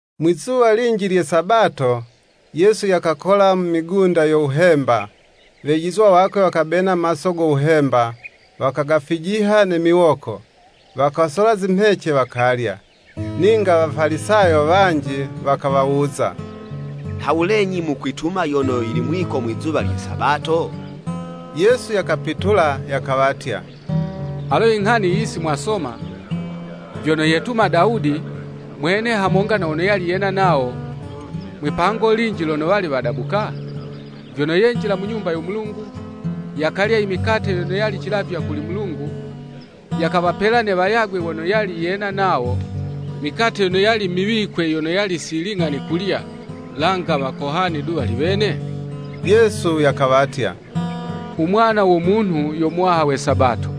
Mwi'zuwa linji lye Sabato, Yesu yakakola mu migunda yo wuhemba; Wejizwa wakwe wakabena maso go wuhemba, wakagafijiha ne miwoko, wakasola zimhece wakalya. Ninga Wafalisayo wanji wakawawuza, “Nhawulenyi mukwituma yono yili mwiko mwizuwa lye Sabato?” Yesu yakapitula yakawatya, “Alo nghani yiyi si mwasoma, vyono yetuma Dawudi, mwene hamonga na wono yali yena nawo, mwipango linji lono wali wadabuka? Vyono yenjila mu Nyumba yo Mulungu, yakalya i mikate yono yali cilavywa kuli Mulungu, yakawapela ne wayagwe wono yali yena nawo; mikate yono yali miwikwe hali, langa wakohani du wali wene?” Yesu yakawatya, “U Mwana wo Munhu yo Muwaha we Sabato.”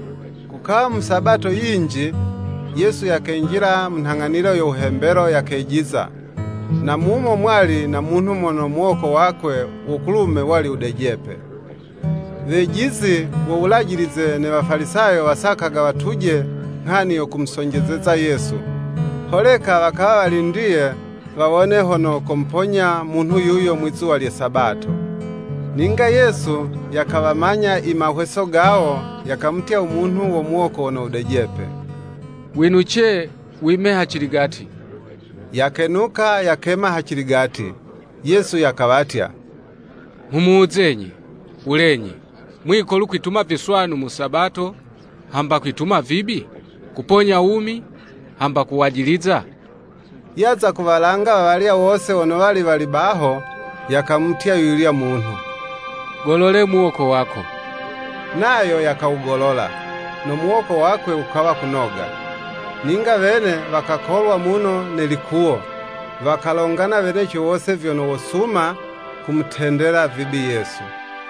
Kukawa mu Sabato yinji, Yesu yakenjila mu nhang'anilo yo wuhembelo, yakejiza, na mumo mwali na munhu mono muwoko wakwe wo kulume wali wudejepe. Wejizi wo Wulajilize ne Wafalisayo, wasakaga watuje nghani yo kumusonjezeza Yesu, holeka wakawa walindiye wawone hono komuponya munhu yuyo mwizuwa lye Sabato. Ninga Yesu yakawamanya i mahweso gawo, yakamutya u munhu wo muwoko wono wudejepe “Winuce, wime haciligati.” Yakenuka yakema haciligati. Yesu yakawatya, Nghumuwuzenyi, “Wulenyi, mwiko lu kwituma viswanu mu Sabato, hamba kwituma vibi? Kuponya wumi, hamba kwajiliza?” Yaza kuwalanga wawalya wose wono wali wali baho, yakamutya yuyulya munhu, “Golola muwoko wako.” Nayo yakawugolola; no muwoko wakwe wukawa kunoga. Ninga wene wakakolwa muno ne likuwo, wakalongana weneco wose vyono wosuma kumutendela vibi Yesu.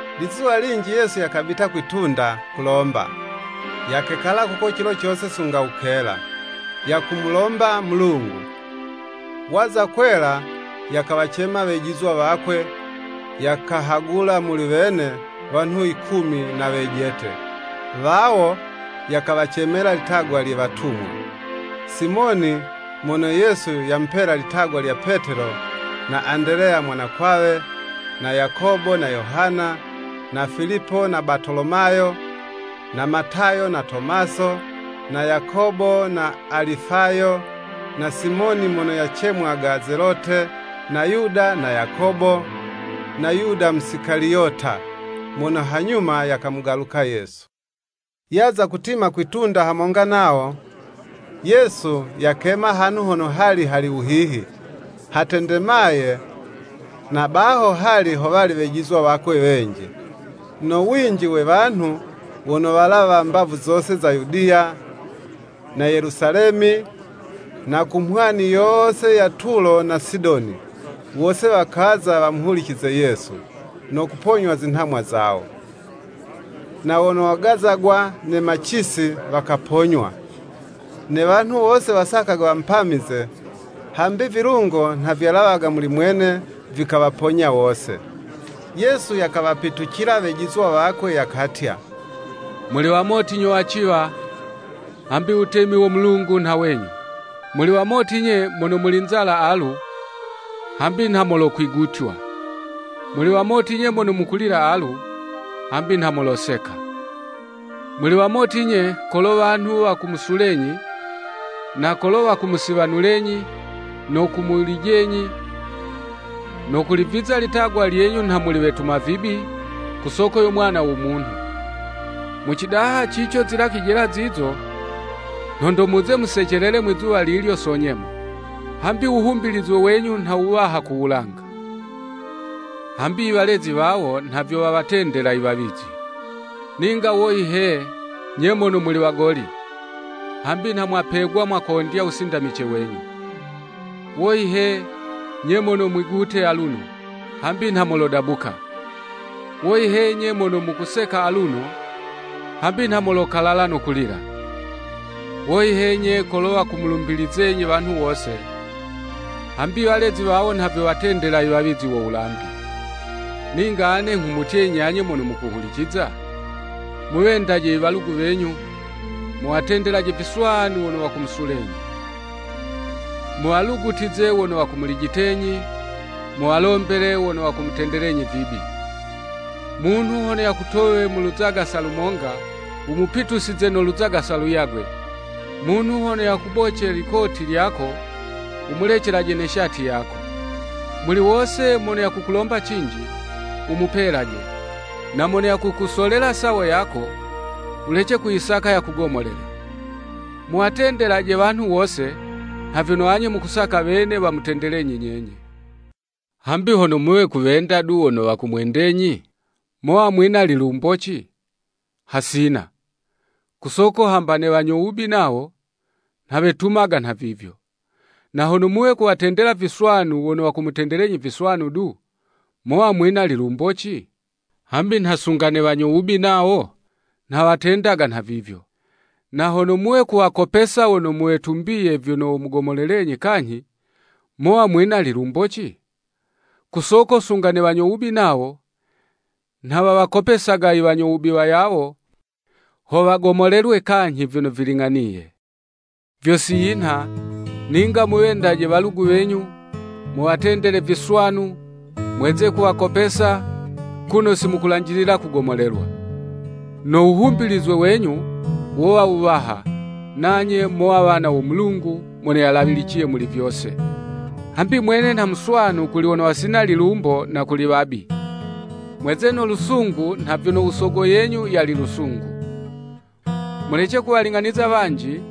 Lizuwa linji Yesu yakabita kwi'tunda, kulomba; yakekala kuko cilo cose sunga wukela, yakumulomba Mulungu. Waza kwela, yakawacema wejizwa wakwe, yakahagula muli wene, wanhu yikumi na wejete, wawo yakawacemela litagwa lye “Watumwa.” Simoni mono Yesu yamupela litagwa lya Petelo na Andeleya mwanakwawe, na Yakobo na Yohana, na Filipo na Batolomayo, na Matayo na Tomaso, na Yakobo na Alifayo, na Simoni mono yacemwaga Zelote, na Yuda na Yakobo, na Yuda Musikaliyota, mono hanyuma yakamugaluka Yesu. Yaza kutima kwi'tunda hamonga nawo, Yesu yakema hanhu hono hali hali wuhihi, hatendemaye, na baho hali howali Wejizwa wakwe wenji, no winji we wanhu wono walawa mbavu zose za Yudiya, na Yelusalemi, na ku mhwani yose ya Tulo na Sidoni, wose wakaza wamuhulicize Yesu, no kuponywa zinhamwa zawo. Na wono wagazagwa ne macisi, wakaponywa. Ne wanhu wose wasakaga wamupamize, hambi vilungo nha vyalawaga muli mwene, vikawaponya wose. Yesu yakawapitucila wejizwa wakwe yakatya, “Muli wamoti nyo waciwa: hambi wutemi wo Mulungu nha wenyu. Muli wamoti 'nye mono muli nzala alu, hambi nha molokwigutywa. Muli wamoti 'nye mono mukulila alu, hambi nha moloseka. “Muli wamoti 'nye, kolo wanhu wakumusulenyi, na kolo wakumusiwanulenyi, no kumulijenyi, no kuliviza litagwa lyenyu nha wetuma vibi, ku soko yo Mwana wo Munhu. Mu cidaha cico zilakwijela zizo, nhondo muze musecelele mwizuwa lilyo so nyemo. Hambi wuhumbilizwe wenyu nha wuwaha ku wulanga. Hambi walezi zawo nha vyo wawatendela i wawizi. Ninga woyi he 'nye mono muli wagoli! Hambi nha mwapegwa mwakondya wusindamice wenyu. Woyi he 'nye mono mwigute aluno, hambi nha molodabuka. Woyi he 'nye mono mukuseka aluno, hambi nha molokalala no kulila. Woyi he nye kolo wakumulumbizenyi wanhu wose, hambi walezi wawo nha vyo wawatendela i wawizi wo wulambi.” “Ninga ane nghumutyenyi anye mono mukuhuliciza, Muwendaje i walugu wenyu, muwatendelaje viswanu wono wakumusulenyi. Muwalugutize wono wakumulijitenyi, muwalombele wono wakumutendelenyi vibi. Munhu hono yakutowe mu luzagasa lumonga, wumupitusize no luzagasa luyagwe; munhu hono yakuboce likoti lyako, wumulecelaje ne shati yako. Muli wose mono yakukulomba cinji, wumupelaje, na mono yakukusolela sawo yako, wulece kuyisaka yakugomolele. Muwatendelaje wanhu wose, nha vyono anye mukusaka wene wamutendelenyi nyenye. “Hambi hono muwe kuwenda du wono wakumwendenyi, mowa mwina lilumboci? Hasina. Ku soko hamba ne wanyo wubi nawo, nha wetumaga nhavivyo. Na hono muwe kuwatendela viswanu wono wakumutendelenyi viswanu du, mowa mwina lilumboci? Hambi nha sunga ne wanyo wubi nawo nha watendaga nhavivyo. Na hono muwe kuwakopesa wono mwitumbiye vyono womugomolelenyi kanyhi, mowa mwina lilumboci? Ku soko sunga ne wanyo wubi nawo nha wawakopesaga i wanyo wubi wayawo, ho wagomolelwe kanyhi vyono viling'aniye. Vyo si yinha, ninga muwendaje walugu wenyu, muwatendelaje viswanu, mweze kuwakopesa, kuno si mukulanjilila kugomolelwa. No wuhumbilizwe wenyu wowa wuwaha, nanye mowa wana wo Mulungu Mono Yalawiliciye Muli Vyose: hambi mwene nha muswanu kuli wono wasina lilumbo na kuli wabi. Mweze no lusungu nha vyono u Sogo yenyu yali lusungu.” “Mulece kuwaling'aniza wanji,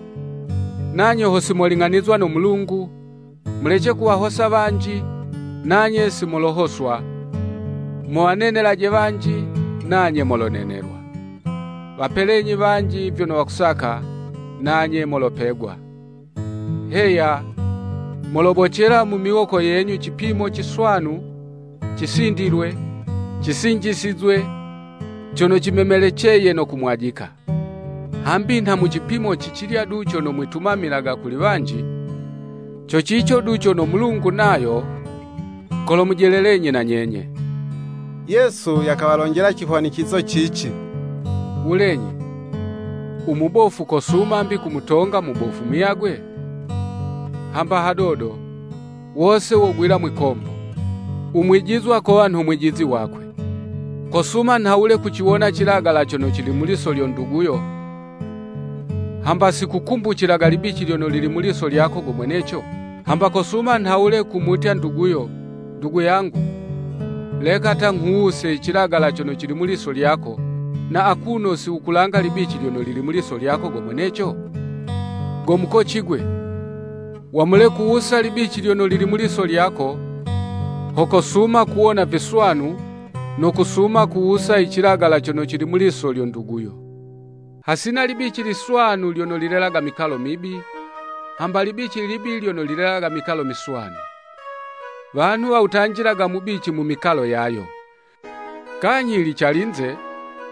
nanye ho si moling'anizwa no Mulungu, mulece kuwahosa wanji, nanye si molohoswa: muwanenelaje wanji, nanye molonenelwa. Wapelenyi wanji vyono wakusaka, nanye molopegwa, Heya molobocela mu miwoko yenyu cipimo ciswanu cisindilwe, cisinjisizwe, cono cimemeleceye, no kumwajika. Hambi nha mu cipimo cicilya du cono mwitumamilaga kuli wanji, co cico du cono Mulungu nayo kolomujelelenyi na nyenye.” Yesu yakawalonjela cihwanicizo cici “Wulenyi, u mubofu kosuma 'mbi kumutonga mubofu muyagwe? Hamba hadodo, wose wogwila mwikombo. U mwijizwa kowa nho mwijizi wakwe. Kosuma nhawule kuciwona cilagala cono cili mu liso lyo nduguyo, hamba si kukumbucilaga libici lyono lili mu liso lyako go mweneco? Hamba kosuma nhawule kumutya nduguyo, ‘Ndugu yangu, leka ta nghuwuse i cilagala cono cili mu liso lyako, na akuno si wukulanga libici lyono lili mu liso lyako go mweneco?’ Go mukoci 'gwe, wamule kuwusa libici lyono lili mu liso lyako, ho kosuma kuwona viswanu no kusuma kuwusa icilagala cono cili mu liso lyo nduguyo.” “Hasina libici liswanu lyono lilelaga mikalo mibi, hamba libici libi lyono lilelaga mikalo miswanu. Wanhu wawutanjilaga mubici mu mikalo yayo. Kanyhi yili calinze,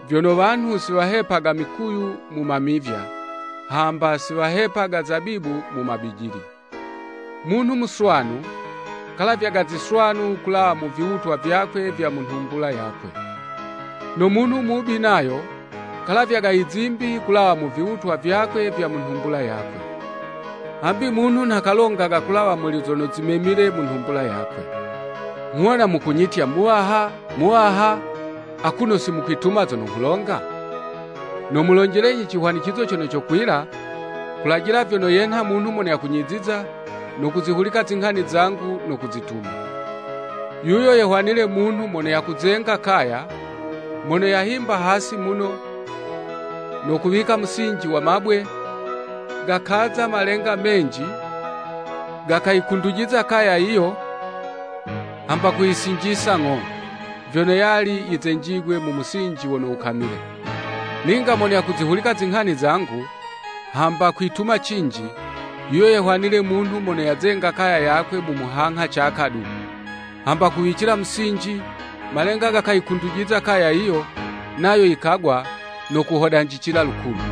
vyono, wanhu si wahepaga mikuyu mu mamivya, hamba si wahepaga zabibu mu mabijili. Munhu muswanu, kalavyaga ziswanu kulawa mu viwutwa vyakwe vya mu nhumbula yakwe. No munhu mubi nayo kalavyaga izimbi kulawa mu viwutwa vyakwe vya mu nhumbula yakwe, hambi munhu nha kalongaga kulawa muli zono zimemile mu nhumbula yakwe.” “Nghuwona mukunyitya, ‘Muwaha, Muwaha,’ akuno si mukwituma zono nghulonga? Nomulonjelenyi cihwanicizo cono cokwila, kulajila vyono yenha mono yakunyiziza, no kuzihulika zinghani zangu no kuzituma. Yuyo yehwanile munhu mono yakuzenga kaya, mono yahimba hasi muno, no kuwika musinji wa mabwe, gakaza malenga menji, gakayikundujiza kaya yiyo, hamba kuyisinjisa ng'o, vyono yali yizenjigwe mu musinji wono wukamile. Ninga mono yakuzihulika zinghani zangu, hamba kwituma cinji, yuyo yehwanile munhu mono yazenga kaya yakwe mu muhangha caka du, hamba kuwicila musinji, malenga gakayikundujiza kaya yiyo, nayo yikagwa no kuhodanjicila lukulu.”